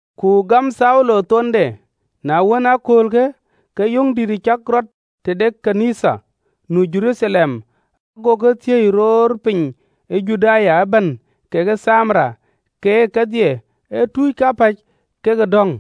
Ku gam Thaulo thonde. Paulo Ayɔŋ ɣön ë Nhialic Na wën, ee aköölkë, ke yöŋ dït cak rɔt tëde ɣön ë Nhialic nu ë Jeruthalem, gokï thiëi roor piny ë Judaya ëbɛ̈n kekë Thamaria, keek kedhie, ee tuuc kapäc kek ë dɔ̈ŋ.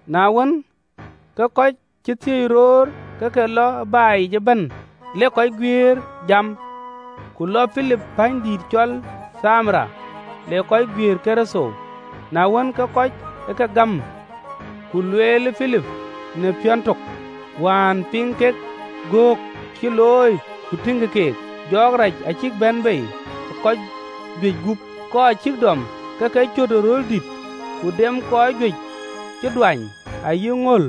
Na wën, ke kɔc cï thiëi roor ke ke lɔ ë baai yic ëbɛ̈n, lek kɔc guiëër jam. Ku lɔ Pilip pänydïït cɔl Thamaria, le kɔc guiëër Kërtho. Na wën, ke kuut ë kɔc ë ke gam ka lueel Pilip në piɔ̈n tök, wään piŋ kek göök cï looi ku tïŋkï keek. Jɔɔk rac acïk bɛ̈n bei ë kɔc juëc gup, kɔc cïk dɔm, ke ke cöt ë röl dït, ku dem kɔc juëc cï duany, ayï ŋöl.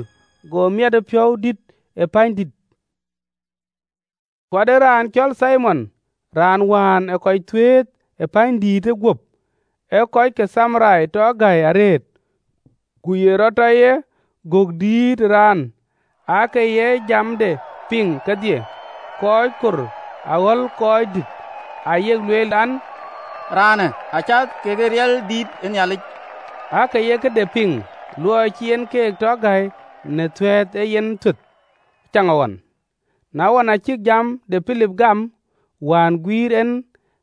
Go miɛtëpiɔ̈u dït ë pänydïïtë. Ku ade raan cɔl Thimon, raan wään ë kɔc thuëëth ë pänydïïtë guöp, ee kɔc de Thamaria tɔ gäi arëët, ku ye rɔt tɔ ye gök dïït ë raan, aake ye jamde piŋ kedhie, kɔc kor aɣɔ̈l röördït, aa yek lueel an, Raanë acath ke riɛl dïït ë Nhialic. Aake ye këde piŋ, luɔi cï en keek tɔ gäi në thuɛ̈th ë yen thuëth ëcaŋɣɔn. Na wën, aa cïk jam de Pilip gam, wään guïïr en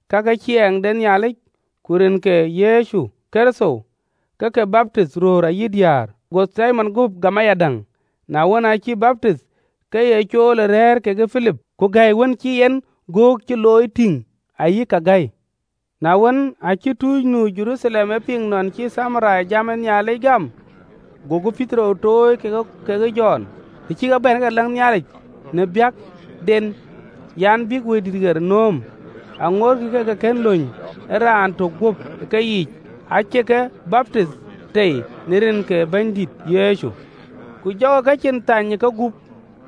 ka ke ciɛɛŋ de Nhialic ku rin ke Yecu Kërtho, ke ke baptith, röör ayï diäär. Go Thimon guöp gam ayadäŋ: na wën, aacï baptith, ke ye cool ë rɛ̈ɛ̈r kekë Pilip, ku gɛ̈i, wën cï en göök cï looi tïŋ ayï kake gäi. Na wën, aacï tuuc nu Jeruthalem e piŋ nɔn cï Thamaria jam ë Nhialic gam, gokï Petero tuöc keek kekë Jɔn: Të cï kek bɛ̈n, ke ke läŋ Nhialic në biäkden an, bïk Wëidït ɣer nööm: Wëidït aake ŋoot ke ke kën bɛ̈n ë raan tök guöp ë keyiic: acï ke baptith tei në rin ke Bɛ̈nydït Yecu. Ku jɔkï kecin thany ë kegup,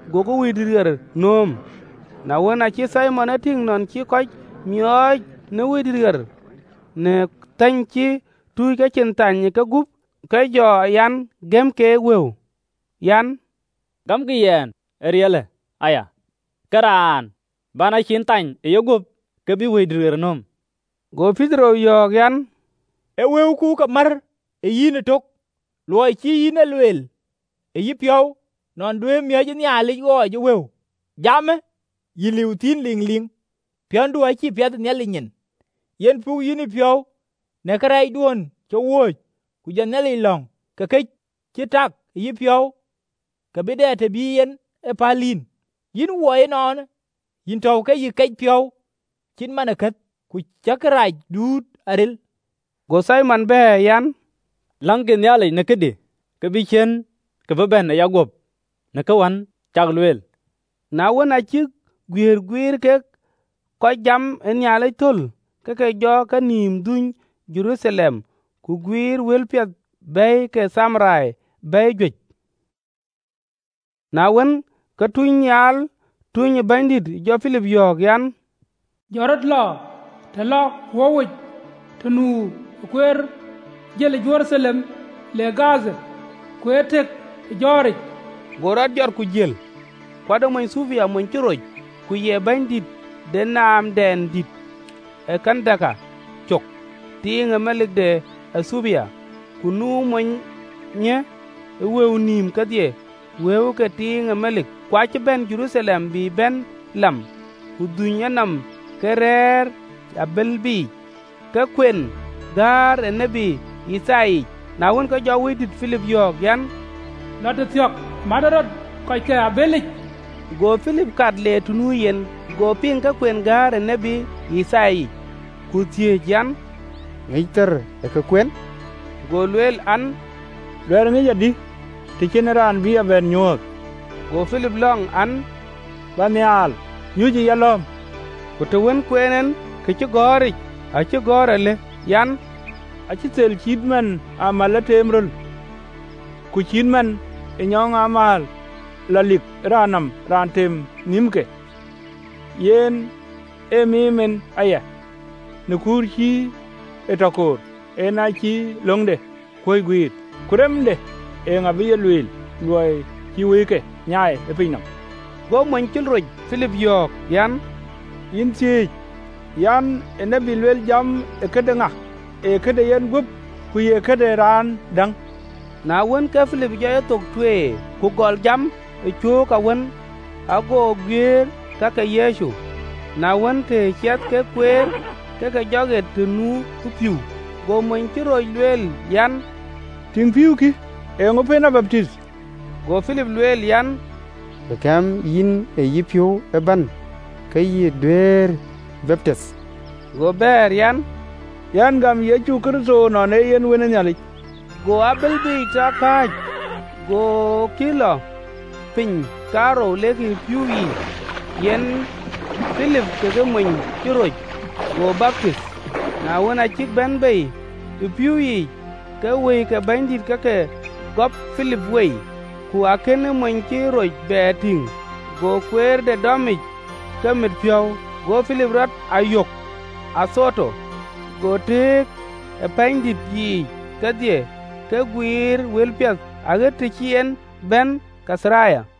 agokï Wëidït ɣer nööm. Na wën, aacï Thimon e tïŋ nɔn cï kɔc miɔɔc në Wëidït në thäny cï tuuc kecin thany ë kegup, ke jɔ an, gëm keek wëu an: “Gämkï yɛn ee riɛlë aya, ke raan bän a cin thany ë yeguöp ke bï Wëidït ɣer nööm.” Go Petero yɔ̈ɔ̈k an, “Ë wëuku ë ke mär ë yïn ëtök, luɔi cï yïn e lueel e yïpiɔ̈u nɔn duëërë miɔ̈c ë Nhialic ɣɔɔc ë wëu! Jamë yïn liu thïn ëliŋliŋ: piɔ̈ndu acïï piɛth ë Nhialic nyin. Yen puk yïn yïpiɔ̈u në kërɛɛcduön cï wööcë, ku jɔ Bɛ̈nydït lɔ̈ŋ, ke kë cï tak ë yïpiɔ̈u ke bï dɛ të bï e yiɛ̈n päl yïn. Yïn wɔi ënɔɔnë, yïn tɔ̈u ke yï kec piɔ̈u cït man ë keth, ku cïï kërac duut aril.” Go Thimon bɛ̈ɛ̈r an, “Läŋkï Bɛ̈nydït në këdï, ke bï ciën kë bï bɛ̈n ë yaguöp në ka wën cäk lueel.” Na wën, aa cïk guiëër guïïr kek kɔc jam ë Nhialic thöl, ke ke jɔ kenïïm dhuöny Jeruthalem, ku guïïrkï wëlpiɛth bɛ̈i ke Thamaria bɛ̈i juëc. Na wën, ke tunynhial tuny ë Bɛ̈nydït jɔ Pilip yɔ̈ɔ̈k an, “Jɔt rɔt, lɔ të lɔ wöuwic, të nu kueer jël ë Jeruthalem le Gadha.” Kueer tëk ë jɔ̈ɔ̈ric. Go rɔt jɔt ku jël: ku ade mony ë Ethiopia, mony cï roc, ku ye bɛ̈nydïït de naamdɛn dït ë Kandake cök, tiiŋ melik de Ethiopia, ku nu monyë ë wëu nïïm kedhie, wëu ke tiiŋ melik, ku aacï bɛ̈n Jeruthalem bï bɛ̈n lam, ku dhuny enɔm ke rɛ̈ɛ̈r ë abëlde yic abël biic, ke kuen gäär ë tiët Yithaya yic. Na wën, ke Wëidït ë jɔ Pilip yɔ̈ɔ̈k an, “Lɔ tëthiɔ̈k, mätë rɔt kɔc ke abëlë yic.” Go Pilip kat le të nu yen, go piŋ ke kuen këcïgɔ̈ɔ̈r ë tiët Yithaya. Go thiëëc an, “Ŋic thar ë ke kuen?” Go lueel an, “Duɛ̈ɛ̈r ŋic adï, të cïn en raan bï a bɛ̈n nyuööth?” Go Pilip lɔ̈ŋ an, bä nhial, nyuc ë yalɔ̈ɔ̈m. (LXX). Ku të wën kueen en këcïgɔ̈ɔ̈ric acï gɔ̈ɔ̈r alë an: “Acï thel cït man ë amäl le teem röl, Ku cït man ë nyɔɔŋ amääl lɔ lik ë raan nɔm raan tem nhïmke, Yen a miim en aya.” Në kuur cï e tɔ koor en acï löŋde kuöc guiir. Ku remde eeŋa bï ye lueel? Luɔi cï wëike nyaai ë piny nɔm.” Go mony cï roc Pilip yɔ̈ɔ̈k an, “Yïn thiëëc an, ë tiët luel jamë ë këde ŋa? Ee këde yen guöp, ku ye këde raan däŋ?” Na wën, ke Pilip jɔ yethok tueer, ku gɔl jam ë cöök awën, ago guiëër ka ke Yecu. Na wën, të ciɛth kek kueer, ke ke jɔ ɣet të nu pïïu: go mony cï roc lueel an, “Tïŋ, pïïu kï, eeŋö pën a baptith?” Go Pilip lueel an, “Të gam yïn ë yïpiɔ̈u ëbɛ̈n, ke yïn duëërë baptith.” Go bɛ̈ɛ̈r an, “Yɛn gam Yecu Kërtho nɔn ee yen Wën ë Nhialic.” Go abël biic tɔ kääc: gokï lɔ piny kaarou lekï ë pïïu yiic, yen Pilip kekë mony cï roc, go baptith. Na wën, aa cïk bɛ̈n bei ë pïïu yiic, ke Wëi ke Bɛ̈nydït ke ke gɔp Pilip wei, ku akënë mony cï roc bɛ tïŋ, go kueerde dɔmic ku mit piɔ̈u. Go Pilip rɔt a yök Adhoto: go tëëk ë wuötiic kedhie, ke guiir wëlpiɛth, aɣet të cï en bɛ̈n Kaitharia.